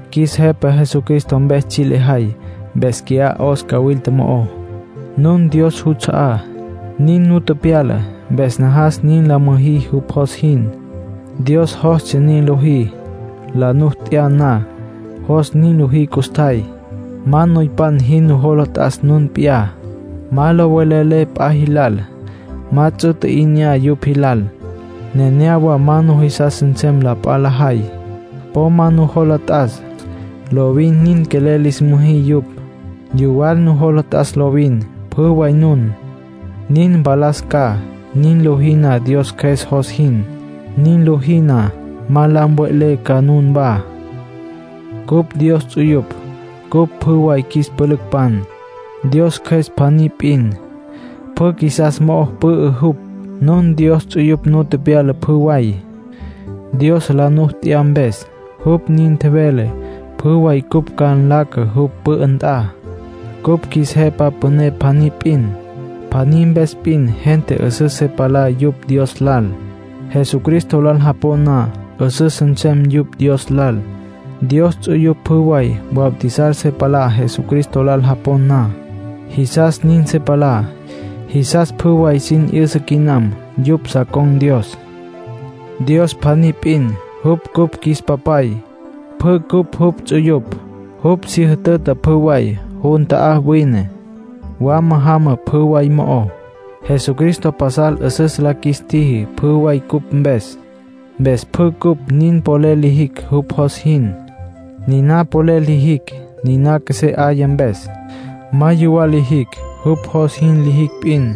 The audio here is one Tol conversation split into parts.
Qjuis Jepa Jesucristo mpes tsji' lejay mpes qui'á 'os cawilta mo'ó. Nun Dios juts'a'á, nin nu tepyala. Mpes najas nin la müjí jupj jos jin. Dios jostsja nin lojí, la nu t'ya na. Jos nin lojí custjay. Ma noypan jin nujola t'as nun p'iyá. Ma lo velelé p'a jilal. Ma ts'u tji'inyá yupj jilal. Nenéyawa ma nujisas nsem la p'a lajay. Po ma nujola t'as. Lovin nin quelel lis müjí yupj. Yuwal nujola t'as lovin, pjü way nun. Nin mpalas ca, nin lojí na Dios Cjües jos jin. Nin lojí na, ma la mve'lé ca nunwá. Cupj Dios ts'uyupj. Cupj pjü way qjuis pülücpan. Dios Cjües pjaní p'in, pjü qjuisas mo'o pü'ü jupj. Nun Dios ts'uyupj nu tepyala pjü way, Dios la nu t'ya mpes. Jupj nin tjevele pjü way cupj ca nlaca jupj pü'ü nt'a. Cupj qjuis Jepa Püné pjaní p'in. Pjaní mpes p'in gente 'üsüs se palá yupj Dios lal. Jesucristo lal japon na, 'üsüs nsem yupj Dios lal. Dios ts'uyupj pjü way bautizar se palá Jesucristo lal japon na. Jisas nin se palá, jisas pjü way sin 'yüsa quinam yupj sa con̈ Dios. Dios pjaní p'in. Jupj cupj qjuis Papay. Pjü cupj jupj ts'uyupj. Jupj si jütüta pjü way. Jun ta'á wine. Wama jama pjü way mo'ó. Jesucristo pasal 'üsüs la qjuis tjiji pjü way cupj mpes. Mpes pjü cupj nin polel lijicj jupj jos jin. Niná polel lijicj, niná qjuesé 'aya mpes. Ma yuwal lijicj; jupj jos jin lijicj p'in.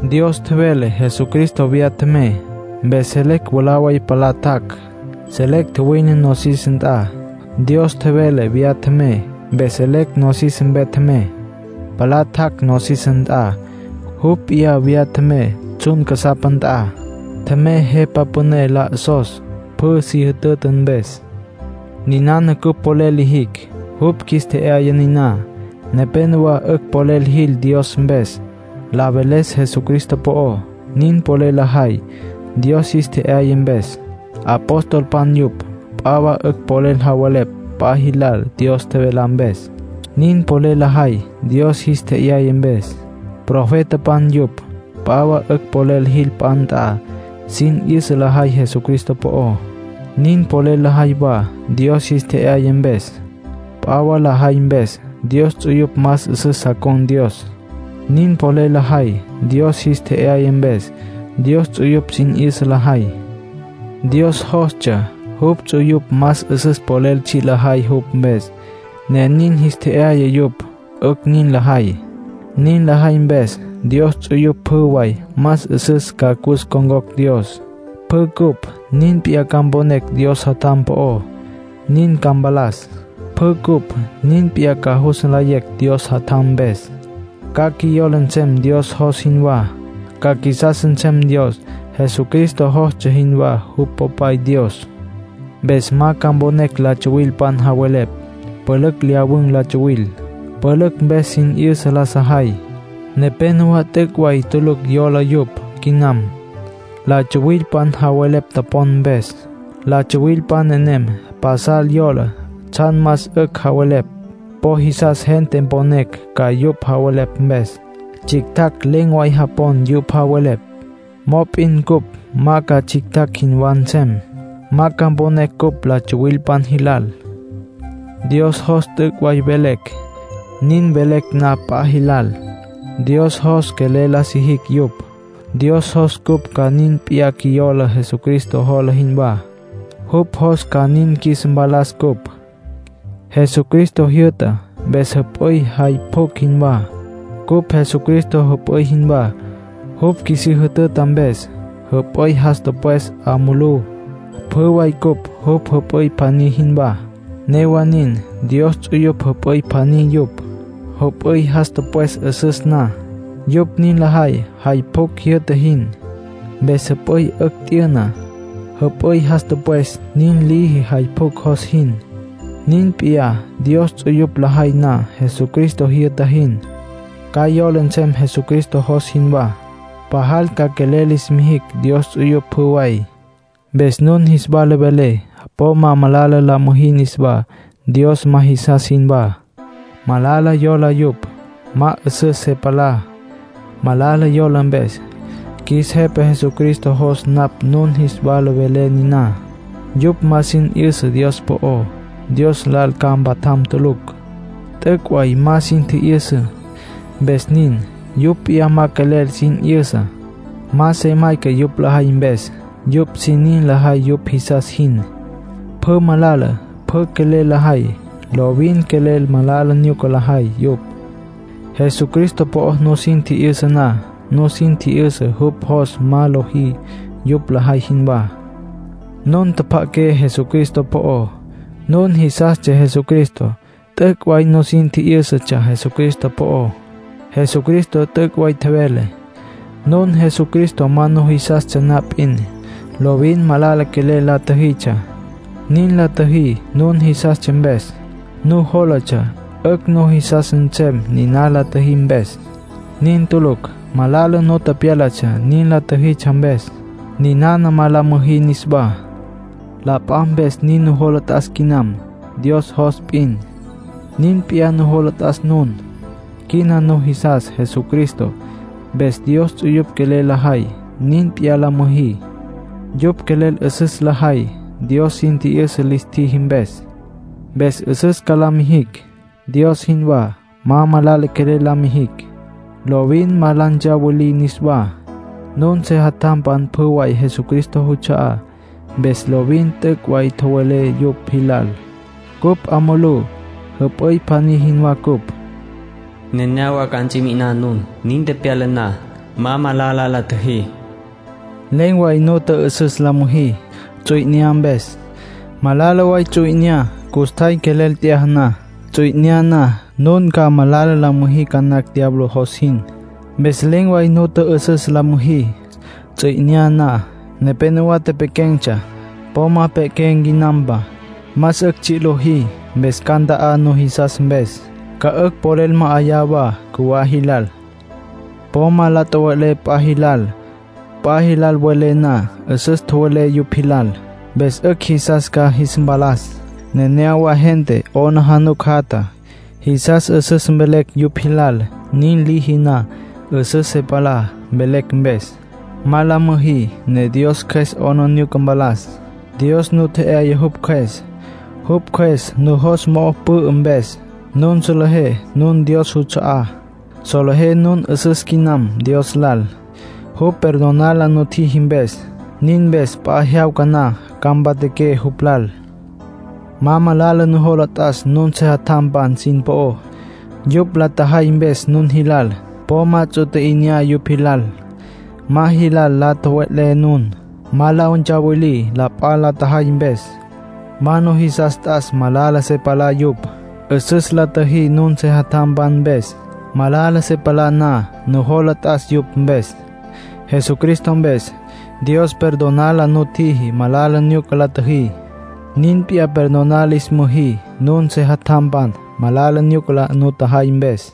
Dios tjevele Jesucristo viyá tjemey. Mpes selecj mwalá way la palá tjac'. Selecj tjuwine nosis nt'a. Dios tjevele viyá tjemey, mpes selecj nosis mpe tjemey. Palá tjac' nosis nt'a. Jupj p'iyá viyá tjemey tsjun casapa nt'a. Tjemey Jepa Püné la 'osos, pjü si jütüta mpes. Ninana cupj polel lijicj, jupj qjuis tje'yaya niná. Nepénowa 'ücj polel jil Dios mpes, la veles Jesucristo po'ó. Nin polel lajay, Dios jis tje'yaya mpes. Apostolpan yupj. P'a wa 'ücj polel javelepj p'a jilal Dios tjevelá mpes. Nin polel lajay, Dios jis tje'yaya mpes. Profetapan yupj. P'a wa 'ücj polel jil p'a nt'a, sin 'yüsa lajay Jesucristo po'ó. Nin polel lajay wa, Dios jis tje'yaya mpes. P'a wa lajay mpes, Dios ts'uyupj más 'üsüs sa con̈ Dios. Nin polel lajay, Dios jis tje'yaya mpes. Dios ts'uyupj sin 'yüsa lajay. Dios jostsja jupj ts'uyupj más 'üsüs polel tsji' lajay jupj mpes, ne nin jis tje'yaya yupj 'ücj nin lajay. Nin lajay mpes Dios ts'uyupj pjü way más 'üsüs ca cus ncon̈cocj Dios. Pjü cupj nin p'iyá ca mponecj Dios Jatjam po'ó, nin ca mpalas. Pjü cupj nin p'iyá ca jus nlayecj Dios Jatjam mpes. Ca qjuiyola nsem Dios jos jinwá. Ca qjuisas nsem Dios, Jesucristo jostsja jinwá jupj Popay Dios. Mpes ma ca mponecj la tsuwilpan javelepj. Pülücj lyawun̈ la tsuwil. Pülücj mpes sin 'yüsa la sajay. Nepénowa t'üc' way tulucj yola yupj quinam, la tsuwilpan javelepj topon mpes. La tsuwilpan nenem pasal yola tsjan más 'ücj javelepj; po jisas gente mponecj ca yupj javelepj mpes. Tsjictjacj len̈ way japon yupj javelepj. Mop'in cupj ma ca tsjictjacj jinwá nsem. Ma ca mponecj cupj la tsuwilpan jilal. Dios jos t'üc' way velecj. Nin velecj na p'a jilal, Dios jos quelel la sijicj yupj. Dios jos cupj ca nin p'iyá qjuiyola Jesucristo jola jinwá. Jupj jos ca nin qjuis mpalas cupj. Jesucristo jyü'ta, mpes jüp'üy jay pjucj jinwá. Cupj Jesucristo jüp'üy jinwá, jupj qjuisí jütüta mpes. Jüp'üy jas tüpwes 'a mulú; pjü way cupj jupj jüp'üy pjaní jinwá. Newa nin, Dios ts'uyupj jüp'üy pjaní yupj. Jüp'üy jas tüpwes 'üsüs na, yupj nin lajay jay pjucj jyü'ta jin. Mpes jüp'üy 'ücj t'yüna. Jüp'üy jas tüpwes nin liji jay pjucj jos jin. Nin p'iyá, Dios ts'uyupj lajay na Jesucristo jyü'ta jin, ca yola nsem Jesucristo jos jinwá. Pajal ca quelel lis mijicj Dios ts'uyupj pjü way. Mpes nun jis wala velé, po ma malala la müjí niswá, Dios ma jisas jinwá. Malala yola yupj. Ma 'üsüs se palá, malala yola mpes. Qjuis Jepa Jesucristo jos napj nun jis wala velé niná. Yupj ma sin 'yüsa Dios po'ó. Dios lal ca mpatjam tulucj. T'üc' way ma sin tji'yüsa, mpes nin. Yupj p'iyá ma quelel sin 'yüsa. Ma se mayca yupj lajay mpes. Yupj sin nin lajay yupj jisas jin. Pjü malala, pjü quelel lajay. Lovin quelel malala nyuca lajay yupj. Jesucristo po'o nusin tji'yüsa na, nusin tji'yüsa jupj jos ma lojí yupj lajay jinwá. Nun tjapja'aqué Jesucristo po'ó. Nun jisastsja Jesucristo. T'üc' way nusin tji'yǘsatsja Jesucristo po'ó. Jesucristo t'üc' way tjevele. Nun Jesucristo ma nujisastsja na p'in, lovin malala quelel la tjüjitsja. Nin la tjüjí nun jisastsja mpes. Nujólatsja 'ücj nujisas nsem nin la tjüjí mpes. Nin tulucj. Malala nu pyálatsja nin la tjüjitsja mpes. Ninana ma la müjí niswá. La p'a mpes nin nujola t'as quinam. Dios jos p'in, nin p'iyá nujola t'as nun. Quina nujisas Jesucristo. Mpes Dios ts'uyupj quelel lajay, nin p'iyá la müjí. Yupj quelel 'üsüs lajay, Dios sin tji'yüsa lis tjiji mpes. Mpes 'üsüs ca la mijicj, Dios jinwá. Ma malala quelel la mijicj. Lovin ma la ntsawilí niswá. Nun sejatjampan pjü way Jesucristo juts'a'á, mpes lovin t'üc' way tjowelé yupj jilal. Cupj 'a mulú, jüp'üy pjaní jinwá ncupj. “Nenéyawa ca ts'i mi'iná nun. Nin tepyala na, ma malala la tjüjí.” Len̈ way nu tjü'ü'süs la müjí, ts'u 'inyá mpes. Malala way ts'u 'inyá custjay quelel t'yaja na. Ts'u 'inyá na, nun ca malala la müjí ca nacj diablo jos jin. Mpes len̈ way nu tjü'ü'süs la müjí, ts'u 'inyá na. Nepénowa tepequen̈tsja. Po ma mpe'qué quinampa. Más 'ücj tsji' lojí. Mpes ca nta'á nujisas mpes. Ca 'ücj polel ma'ayá wa cjuwá jilal. Po ma malala tjowelé p'a jilal. P'a jilal welé na, 'üsüs tjowelé yupj jilal. Mpes 'ücj jisas ca jis mpalas. Nenéyawa gente 'aplijila jatja, jisas 'üsüs mvelecj yupj jilal. Nin lijicj na, 'üsüs se palá, velecj mpes. Ma la müjí ne Dios Cjües 'aplijila mpalas. Dios nu tje'yaya jupj Cjües. Jupj Cjües nujos mo'o pü'ü mpes, nun solejé nun Dios juts'a'á. Solejé nun 'üsüs quinam Dios lal, jupj perdonar la nutjiji mpes. Nin mpes p'a jyawca na ca mpatjaqué jupj lal. Ma malala nujola t'as nun sejatjampan sin po'ó, yupj la tjajay mpes nun jilal. Po ma ts'u tji'inyá yupj jilal. Ma jilal la tjowe'lé nun. Ma la ntsawilí la p'a la tjajay mpes. Ma nujisas t'as malala se palá yupj. 'Üsüs la tjüjí nun sejatjampan mpes. Malala se palá na, nujola t'as yupj mpes. Jesucristo mpes, Dios perdonar la nutjiji malala nyuca la tjüjí. Nin p'iyá perdonar lis müjí nun sejatjampan malala nyuca la nutjajay mpes.